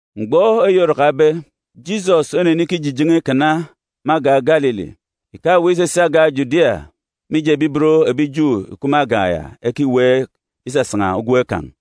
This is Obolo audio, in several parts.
Mgbọ eyi orakabe, Jisọs onenikijijen̄e ikana me agan̄ Galili. Ìkaweek isisi agan̄ Judia mije ebi ibot ebi Ju ìkup me agan̄ ya ekiweek isasan̄a ugwem kan̄.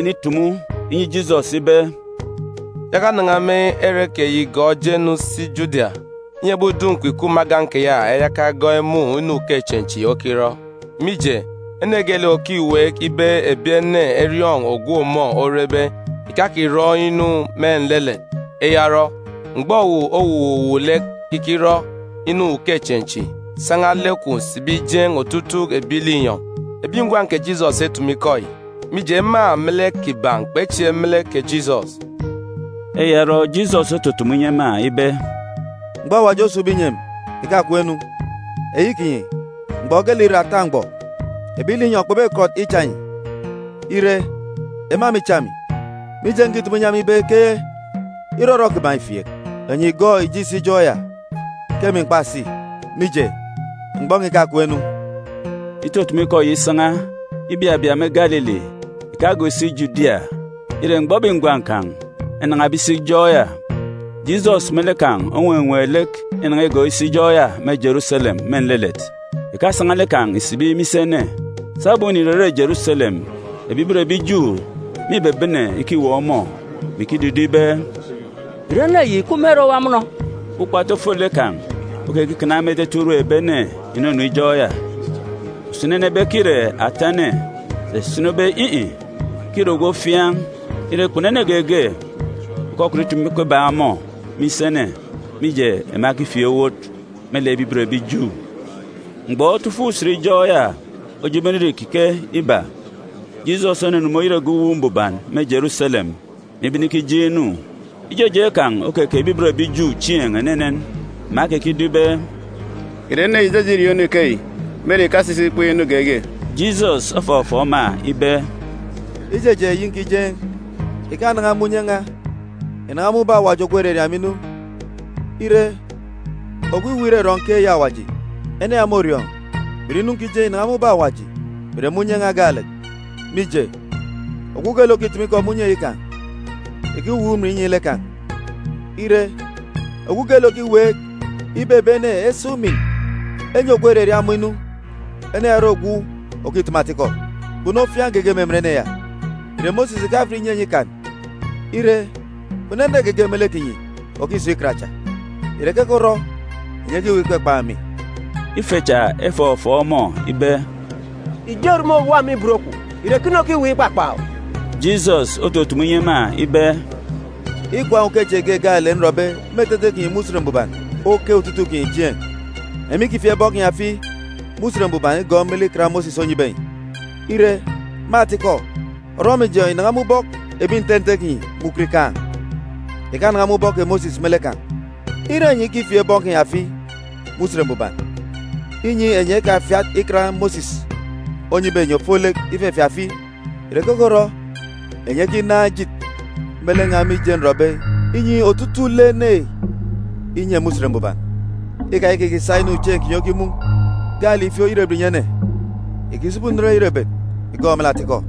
ebi ngwan̄ kè Jisọs enenitumu inyi Jisọs ibe, “Yaka nan̄a me ere keyi gọọk je-nu si Judia, inyi ebi udun̄ kwun̄ ìkup me agan̄ keya eyaka egọọk emun̄ inu ukechieen̄ chi okirọ. Mije, ene geelek òkiweek ibe ebi ene eriọọn̄ ogwu ọmọ orebe ìkakirọ inu me nlelet. Eya orọ, mgbọ owu owuwuuk lek ikirọ inu ukechieen̄ chi, san̄a lek kwun̄ sibi jeen̄ otutuuk ebi linyọn̄.” Ebi ngwan̄ kè Jisọs etumu ikọ yi, mije, ema me lek kiban̄ kpechieek me lek kè Jisọs. Eya orọ, Jisọs otutumu inyi ema ibe, “Mgbọ Awaji osun̄be inyi emi ìkakem-nu. Eyi kinyi, mgbọ geelek ìre ata mgbọ. Ebi linyọn̄ kpebekọt icha enyi. Ire, ema mîcha emi, mije nkitumu inyi ema ibe ke irọrọ kiban̄ îfieek. Enyi ìgọọk ìje ìsi ijọk ya, ke emi m̀kpasi, mije, mgbọ n̄a ìkakem-nu.” Itutumu ikọ yi isan̄a, ibabia me Galili, ìkagọọk isi Judia. Ire, mgbọ ebi ngwan̄ kan̄ enan̄abe isi ijọk ya, Jisọs me lek kan̄ onwenween̄ lek inan̄a igọọk isi ijọk ya me Jeruselem me nlelet, ìkasan̄a lek kan̄ ìsibi me isi ene. Sabum înirere Jeruselem, ebi ibot ebi Ju mîbebene ikiweek ọmọ, mè ikidido ibe, “Ìre ene yi ìkup me ere owa mọnọ?” Ukpatu ofolek kan̄ okekikana me etete urum ebi ene ìnunu ijọk ya. Usini ene ebe ke îre ata ene, sà usini ebe in̄-in̄, ke îre ogwu ofiaan̄. Ire, kpunu ene geege òkọkọt itumu ikọ ibak ọmọ me isi ene, mije, ema ekifieek owot me lek ebi ibot ebi Ju. Mgbọ otu ifuk usen ijọk ya ojebe inire ìkike iba, Jisọs onunu me oyet egep Uwu Mbuban me Jeruselem, mè ibene ikijeen̄ inu. Ijejeen̄ kan̄ okeke ebi ibot ebi Ju chieen̄ enenen. Ema ekekido ibe, “Ìre ene yi ìjeje iriọọn̄ inu ikeyi me ere ìkasisi ìkween̄ inu geege?” Jisọs ofọfọọk ema ibe, “Ijejeen̄ eyi nkijeen̄ ìkanan̄a me unye n̄a, ìnan̄a me ubọk Awaji ogwu òraria emi inu. Ire, ogwu iweek irọrọ nkeek eyi Awaji, ene ya môriọọn̄ mè ìre inu nkijeen̄ ìnan̄a me ubọk Awaji, mè ìre me unye n̄a gaalek. Mije, ogwu geelek òkitumu ikọ me unye eyi kan̄ ìkiweek umin inyi lek kan̄. Ire, ogwu geelek òkiweek ibe ebi ene esa umin enyi ogwu òraria ọmọ inu, ene ya ore ogwu òkitumu atikọ, kpunu ofiaan̄ geege me emen ene ya. Ìre Mosis ìkafat ìnyi enyi Ikan? Ire, kpunu ene geege me lek kinyi òkisun̄ Ikan cha. Ìre keke orọ enyi ekiweek ikpakpan̄ emi?” Ife cha efọfọọk ọmọ ibe, “Ijo erumun̄ òwa me ibot kwun̄! Ìre ekene okiweek ikpakpan̄ owu?” Jisọs otutumu inyi ema ibe, “Ikwaan̄ ukechieen̄ ge gaalek nrọbe me etete kinyi me Usen Mbuban oke otutuuk kinyi chieen̄. Enyi mîkifieek bọn kinyi afi me Usen Mbuban igọọk me lek Ikan Mosis onyibe enyi.a (Ire, me atikọ, orọmijọn̄ yi ìnan̄a me ubọk ebi nte nte kinyi me ukot ikaan̄, ìkanan̄a me ubọk kè Mosis me lek kan̄.) Ire enyi ikifieek bọn kinyi afi me Usen Mbuban, inyi enyi ekafiat Ikan Mosis onyibe enyi ofolek ifefieek afi, ìre keke orọ enyi ekinaan̄ ejit me lek n̄a mije nrọbe inyi otutuuk lek ene inye me Usen Mbuban? Ikayaka ìkisa inu chieen̄ kinyi okimun̄ gaalek ìfieek oyerebet ìnyi ene. Ìkisibi unen oyerebet ìgọọk me lek atikọ.”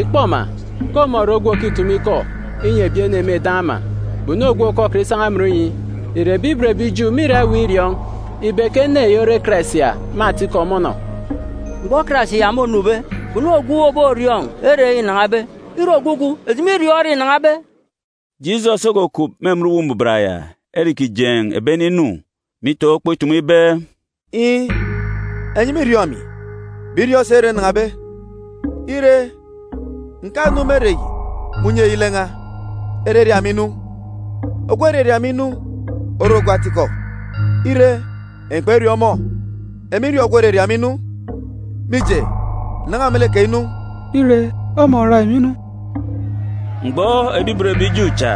Ìkpọ ma, ke ọmọ ire ogwu òkitumu ikọ inyi ebi ene me eden̄ ama, kpunu ogwu òkọkọt isan̄a amọn inyi. Ìre ebi ibot ebi Ju mîra iweek iriọọn̄ ibe ke ene yi ore Karais ya me atikọ mọnọb? Mgbọ Karais ya mônube, kpunu ogwu òboriọọn̄ ere înan̄abe. Ire ogwugwu, eji mîriọọn̄ ere înan̄abe.” Jisọs okukup me emen Uwu Mbuban ya ere îkijeen̄ ebi ene inu, mè itaan̄ ukpo itumu ibe, “Iin̄, enyi mîriọọn̄ emi, mè iriọọn̄ si ere nnan̄abe. Ire, ǹkanu me ere yi me unye eyi lek n̄a, eraria emi inu. Ogwu òraria emi inu ore ogwu atikọ. Ire, enyi kperiọọn̄ ọmọ. Emi nriọọn̄ ogwu òraria emi inu, mije, ǹnan̄a me lek kan̄ inu. Îre ọmọ oria emi inu.” Mgbọ ebi ibot ebi Ju cha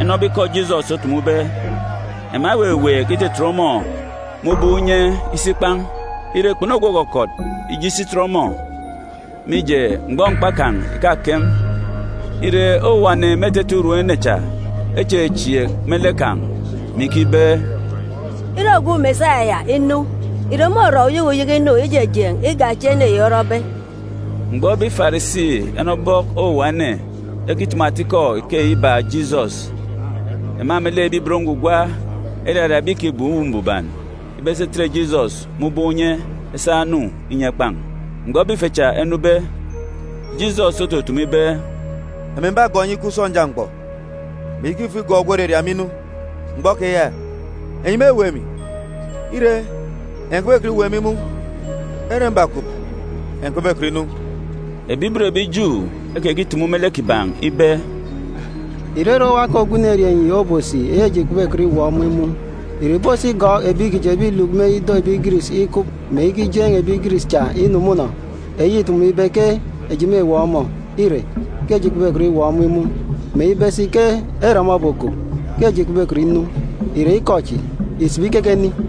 enọbe ikọ Jisọs otumube, ema eweweek itetet ọmọ me ubọk unye isi ikpan̄. Ire, kpunu ogwu òkọkọt ije isi itet ọmọ, mije, mgbọ mkpa kan̄ ìkakem. Ire, owuwa ene me etete urum ene cha echechieek me lek kan̄, mè ikibe, “Ire ogwu Mesaya ya inu, ìre môrọ uyeke uyeke inu ijejeen̄ igak echi ene yi orọbe?” Mgbọ ebi Farisi enọbe ubọk owuwa ene ekitumu ata ikọ ikeyi ibak Jisọs, ema melek ebi ibot ngwugwa eraria ebi ìkibem Uwu Mbuban ibe esi etet Jisọs me ubọk unye esa enu inyi ekpan̄. Mgbọ ebi ife cha enube, Jisọs otutumu ibe, “Emi m̀bagọọk enyi ikup sọnja mgbọ, mè iyaka ifo igọọk ogwu òraria emi inu. Mgbọ keya, enyi mêweek emi, ire, enyi kpebekọt iweek emi imun̄. Ere mbakup, enyi kpebekọt inu.” Ebi ibot ebi Ju ekekitumu me lek kiban̄ ibe, “Ìre ere owa ke ogwu enerieen̄ yi obosi eyi eji kpebekọt iweek ọmọ imun̄? Ìre ìbosi igọọk ebi kiji ebi ìluk me ido ebi Giris ikup, mè ikijeen̄ ebi Giris cha inu mọnọ? Eyi îtumube ibe ke eji mêweek ọmọ, ire, ke eji kpebekọt iweek ọmọ imun̄, mè ibe si ke ere ọmọ obokup, ke eji kpebekọt inu, ìre ikọ kechi ìsibi keke ni?”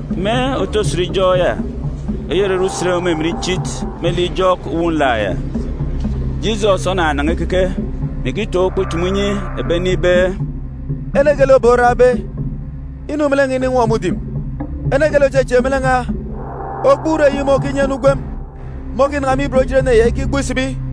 Me òta usen ijọk ya, eyi òrere usen òmimin ichit me lek ijọk Uwu Nlak ya, Jisọs onanan̄a ikeke, mè ikitaan̄ ukpo itumu inyi ebi ene ibe, “Ene geelek ebek orakbe, inu me lek n̄a ininwọ mudim. Ene geelek òchechieek me lek n̄a, ogbuuruk eyi mun̄ òkinyi ene ugwem môkinan̄a me ibot ejit ene ya ikigbuk isibi,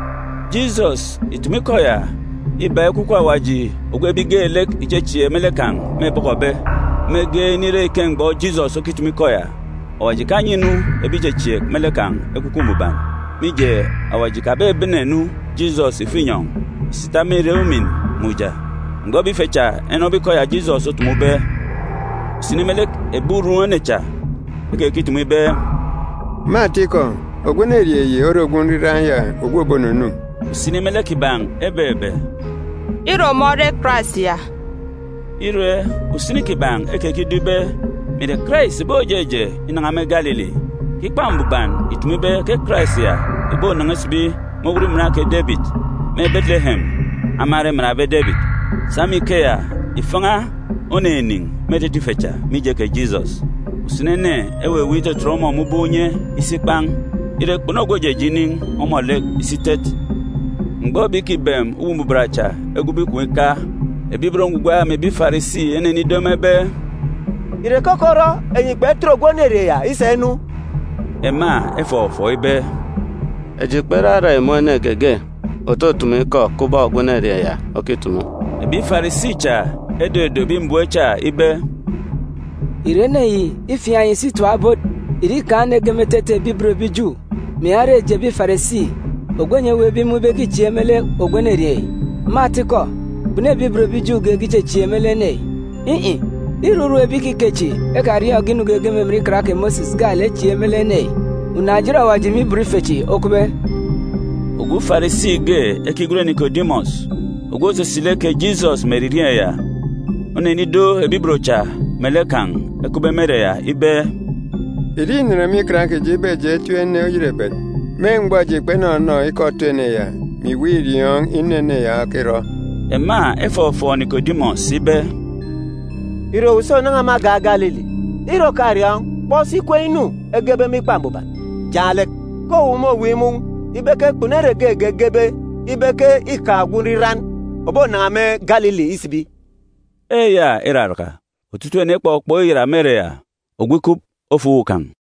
Jisọs ìtumu ikọ ya ibak Ekwukwu Awaji ogwu ebi geelek ìchechieek me lek kan̄ mêbọkọbe. Mege inire ike mgbọ Jisọs okitumu ikọ ya, Awaji ìkanyi-nu ebi ìchechieek me lek kan̄ Ekwukwu Mbuban, mije, Awaji ìkabene-nu Jisọs ìfo inyọn̄ ìsi ìtap me irek ujamgbugbo. Mgbọ ebi ife cha enọbe ikọ ya Jisọs otumube, usini me lek ebi urum ene cha ekekitumu ibe, “Me atikọ, ogwu enerieen̄ yi ore ogwu Nriran ya ogwu òbonunu.” Usini me lek kiban̄ ebebe, “Îre ọmọ ore Karais ya!” Ire, usini kiban̄ ekekido ibe mè ìre Karais ìbojeje inan̄a me Galili; ke Ikpa Mbuban ìtumu ibe ke Karais ya ìbonan̄a isibi me owot iman kè Debit me Beteleyem, ama ere emanbe Debit. Sa me ikeya, ifan̄a oninin̄ me etete ife cha, mije kè Jisọs. Usini ene eweweek itetet ọmọ me ubọk unye isi ikpan̄. Ire, kpunu ogwu òjeje inin̄ ọmọ lek isi itet. Mgbọ ebi ìkibem Uwu Mbuban cha egwube ikom ika, ebi ibot ngwugwa mè ebi Farisi enenido ema ibe, “Ìre keke orọ enyi kpetet ogwu enerieen̄ ya isa inu?” Ema efọfọọk ibe, “Eji kperarak imun̄ ene geege òtutumu ikọ kubọk ogwu enerieen̄ ya okitumu.” Ebi Farisi cha edodo ebi mbem cha ibe, “Ìre ene ya îfiaan̄ enyi si itap ebot? Ìre îkaan̄ ene ge me etete ebi ibot ebi Ju, mè ìyaka ire eji ebi Farisi ogwu enyi eweekbe imun̄ ibe ke îchieek me lek ogwu enerieen̄ yi? Me atikọ, kpunu ebi ibot ebi Ju geege ìchechieek me lek ene yi. In̄-in̄, îre urum ebi ikike chi ekariọọn̄ge inu geege me emen Ikan kè Mosis gaalek echieek me lek ene yi. Unaan̄-ejit Awaji me ibot ife chi okupbe.” Ogwu Farisi ge ekigwen Nikodimọs, ogwu òsisi lek kè Jisọs me eririeen̄ ya, onenido ebi ibot cha melek kan̄ ekupbe me ere ya ibe, “Ìre înen me Ikan kiji ibe eji etip ene oyerebet me mgbọ eji kpenọnọ ikọ otu ene ya, mè iweek iriọọn̄ inu ene ya okirọ?” Ema efọfọọk Nikodimọs ibe, “Ìre owu si ònan̄a me agan̄ Galili? Ire òkariọọn̄, kpọk si kween̄ inu egebe me Ikpa Mbuban jaan̄ lek, ke owu môweek imun̄ ibe ke kpunu ere geege egebe ibe ke îkaan̄ ogwu Nriran òbonan̄a me Galili isibi.” Eya iraraka, otutuuk ene ekpọkpọk iyat me ere ya, ogwu ikup, ofo uwu kan̄.